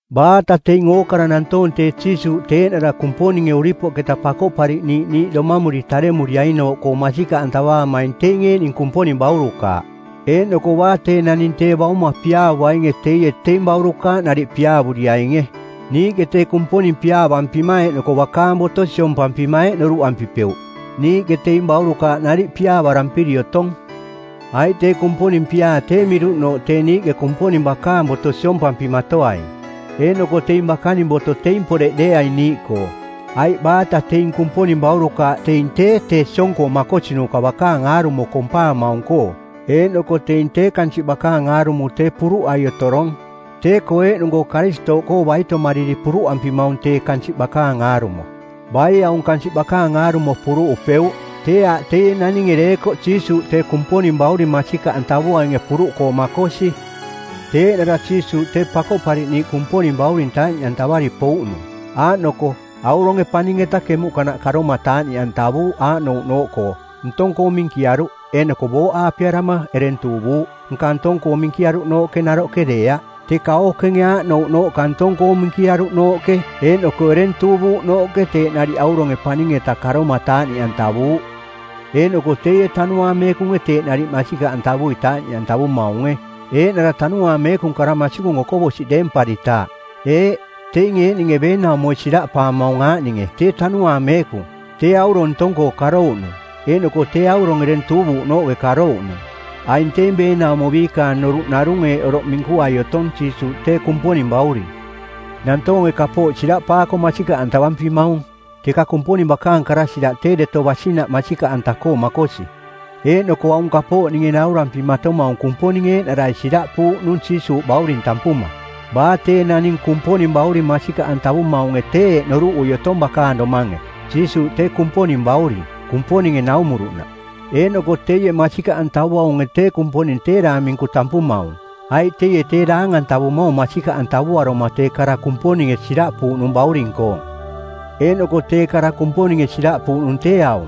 Baata teing ookara nantoong tee Jiisuuꞌ tee eeꞌnara Kumponinge uripoꞌketa Pakoꞌpariꞌniiꞌ niiꞌ domamuri taremuriainooꞌkoo masikaꞌantavaamaing teing eeꞌning Kumponing baurukaaꞌ, eeꞌnoko baa tee naning tee Bauma piaavuainge teie teing baurukaaꞌ nariꞌ piaavuriainge. Niiꞌke tee Kumponing piaavampima eeꞌnoko bakaang boto siompampima eeꞌ noruꞌampipeuꞌ, niiꞌke teing baurukaaꞌ nariꞌ piaavarampiri otong. Aiꞌ tee Kumponing piaa tee miruꞌnooꞌ tee niiꞌke Kumponing bakaning boto siompampimatoaing. Eeꞌnoko teing bakaning boto teing poreꞌ deeaing niiꞌkoo. Aiꞌ baata teing Kumponing baurukaaꞌ teing tee tee siong-koo makosinuka bakaang aarumo kompaamaung-koo, eeꞌnoko teing tee kansiꞌ bakaang aarumo tee puruꞌai otorong. Tee-koo eeꞌnung-koo Karistooꞌkoo baitomariri puruꞌampimaung tee kansiꞌ bakaang aarumo. Baie aung kansiꞌ bakaang aarumo puruꞌupeuꞌ? Tee aaꞌ teie naninge deekoꞌ Jiisuuꞌ tee Kumponing Bauring masikaꞌantavuainge puruꞌkoo makosi. Tee eeꞌnara Jiisuuꞌ tee Pakoꞌpariꞌniiꞌ Kumponing Bauring taaꞌniꞌantavari pouꞌnung, aaꞌnoko: auronge paning-eta kemuꞌkanaꞌ karoma taaꞌniꞌantavuuꞌ aaꞌnouꞌnooꞌkoo: ntong-koo minkiaruꞌ eeꞌnoko booꞌaapearama ereng tuuvuuꞌ. Nka ntong-koo minkiaruꞌnooꞌke naroꞌke deeaꞌ, teka ookenge aaꞌnouꞌnooꞌka ntong-koo minkiaruꞌnooꞌke eeꞌnoko ereng tuuvuuꞌnooꞌke teeꞌ nariꞌ auronge paning-eta karoma taaꞌniꞌantavuuꞌ. Eeꞌnoko teie Tanuaang Meekunge teeꞌ nariꞌ masikaꞌantavui taaꞌniꞌantavumaunge, eeꞌnara Tanuaang Meekung kara masikung okoꞌbosiꞌ deemparitaaꞌ. Eeꞌ, teinge eeꞌninge beenaumoi siraꞌpaamaung aaꞌninge tee Tanuaang Meekung, tee aurong ntong-koo karouꞌnung, eeꞌnoko tee aurong ereng tuuvuuꞌnooꞌke karouꞌnung. Aing teing beenaumo biikaang noruꞌ narung eeꞌ oroꞌ minkuai otong Jiisuuꞌ tee Kumponing bauring. Nantoonge kapooꞌ siraꞌpaako masikaꞌantavampimaung, teka Kumponing bakaang kara siraꞌ tee deto basinaꞌ masikaꞌanta-koo makosi, eeꞌnoko aung kapooꞌ ninge naurampimatomaung Kumponinge eeꞌnarai siraꞌpuuꞌnung Jiisuuꞌ Bauring tampuma. Baa tee naning Kumponing Bauring masikaꞌantavumaunge tee eeꞌ noruꞌui otong bakaang domange, Jiisuuꞌ tee Kumponing Bauring Kumponinge naumuruꞌnaꞌ. Eeꞌnoko teie masikaꞌantavuaunge tee Kumponing tee daang minku tampumaung, aiꞌ teie tee daang-antavumaung masikaꞌantavuaruma tee kara Kumponinge siraꞌpuuꞌnung bauring-koong. Eeꞌnoko tee kara Kumponinge siraꞌpuuꞌnung tee aung: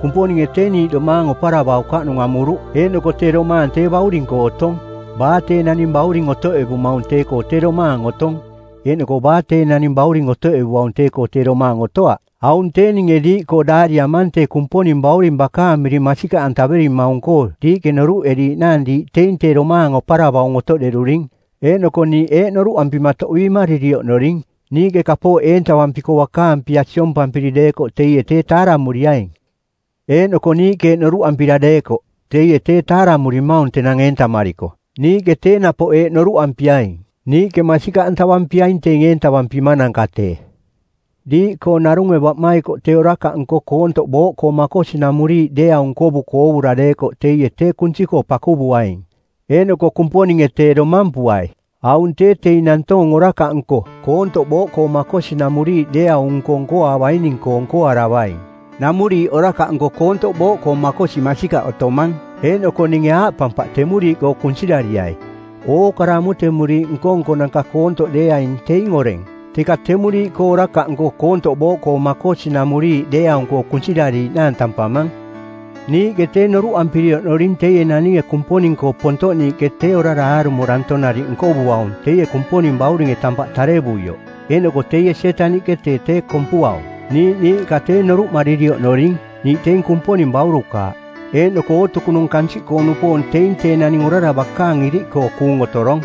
Kumponinge tee niiꞌ domaang oparavaukaꞌnung amuruꞌ, eeꞌnoko tee domaang tee Bauring-koo otong. Baa tee naning Bauring otoꞌevumaung tee-koo tee domaang otong, eeꞌnoko baa tee naning Bauring otoꞌevuaung tee-koo tee domaang otoaꞌ. Aung tee ninge diiꞌkoo daariamang tee Kumponing Bauring bakaang miring masikaꞌantaverimaung-koo diiꞌke noruꞌeriiꞌnaang diiꞌ teing tee domaang oparavaung otoꞌderuring. Eeꞌnoko niiꞌ eeꞌ noruꞌampima toꞌbiimariri oꞌnoring: Niiꞌke kapooꞌ eentavampiko bakaang pia siompampiri deekoꞌ teie tee taaramuriaing. Eeꞌnoko niiꞌke eeꞌ noruꞌampira deekoꞌ, “Teie tee taaramurimaung tenang eentamariko,” niiꞌke tee napoꞌ eeꞌ noruꞌampiaing, “Niiꞌke masikaꞌ nkavampiaing teing eentavampimananka tee.” Diiꞌkoo narunge baꞌmaikoꞌ tee orakaꞌnko koontoꞌ booꞌkoo makosinamuriiꞌ deeaung nkovuko oovura deekoꞌ teie tee kunsi-koo pakuvuaing, eeꞌnoko Kumponinge tee domampuai. Aung tee teing nantoong orakaꞌnko, koontoꞌ booꞌkoo makosinamuriiꞌ deeaung-nko nkoaavaining-koo nkoaravaing. Namuriiꞌ orakaꞌnko koontoꞌ booꞌkoo makosi masikaꞌ otomang, eeꞌnoko ninge aaꞌpampaꞌ temuriiꞌkoo kunsirariai. Ookara amutemuriiꞌ nko-nkonanka koontoꞌ deeaing teing oreng, teka temuriiꞌkoo orakaꞌnko koontoꞌ booꞌkoo makosinamuriiꞌ deeaung-koo kunsirariiꞌnaang tampamang. Niiꞌke tee noruꞌampiri oꞌnoring teie naninge Kumponing-koo pontoꞌniiꞌke tee orara aarumo danto nariꞌ nkovuaung teie Kumponing Bauringe tampaꞌ tarevuioꞌ. Eeꞌnoko teie Sietaniꞌke tee tee kompuaung. Niiꞌ niiꞌka tee noruꞌmariri oꞌnoring, niiꞌ teing Kumponing Baurukaaꞌ, eeꞌnoko ootukunung kansiꞌkoo-nupoong teing tee naning orara bakaang iriꞌkoo kuung otorong.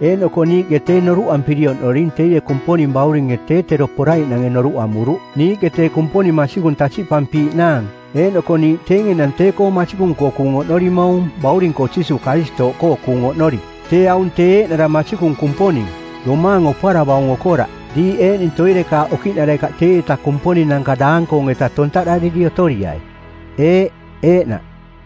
Eeꞌnoko niiꞌke tee noruꞌampiri oꞌnoring teie Kumponing Bauringe tee tero poraiꞌnange noruꞌ amuruꞌ, niiꞌke tee Kumponing Masikung tasiꞌpampiiꞌnaang eeꞌnoko niiꞌ teing enang tee-koo masikung-koo kuung oꞌnorimaung Bauring-koo Jiisuuꞌ Karistooꞌkoo kuung oꞌnori, tee aung tee eeꞌnara Masikung Kumponing, domaang oparavaung okoraꞌ. Diiꞌ eeꞌning toirekaaꞌ okiꞌnarekaꞌ teieta kumponinanka daang-koong-eta tontaꞌdariri otoriai. Eeꞌ, eeꞌnaꞌ.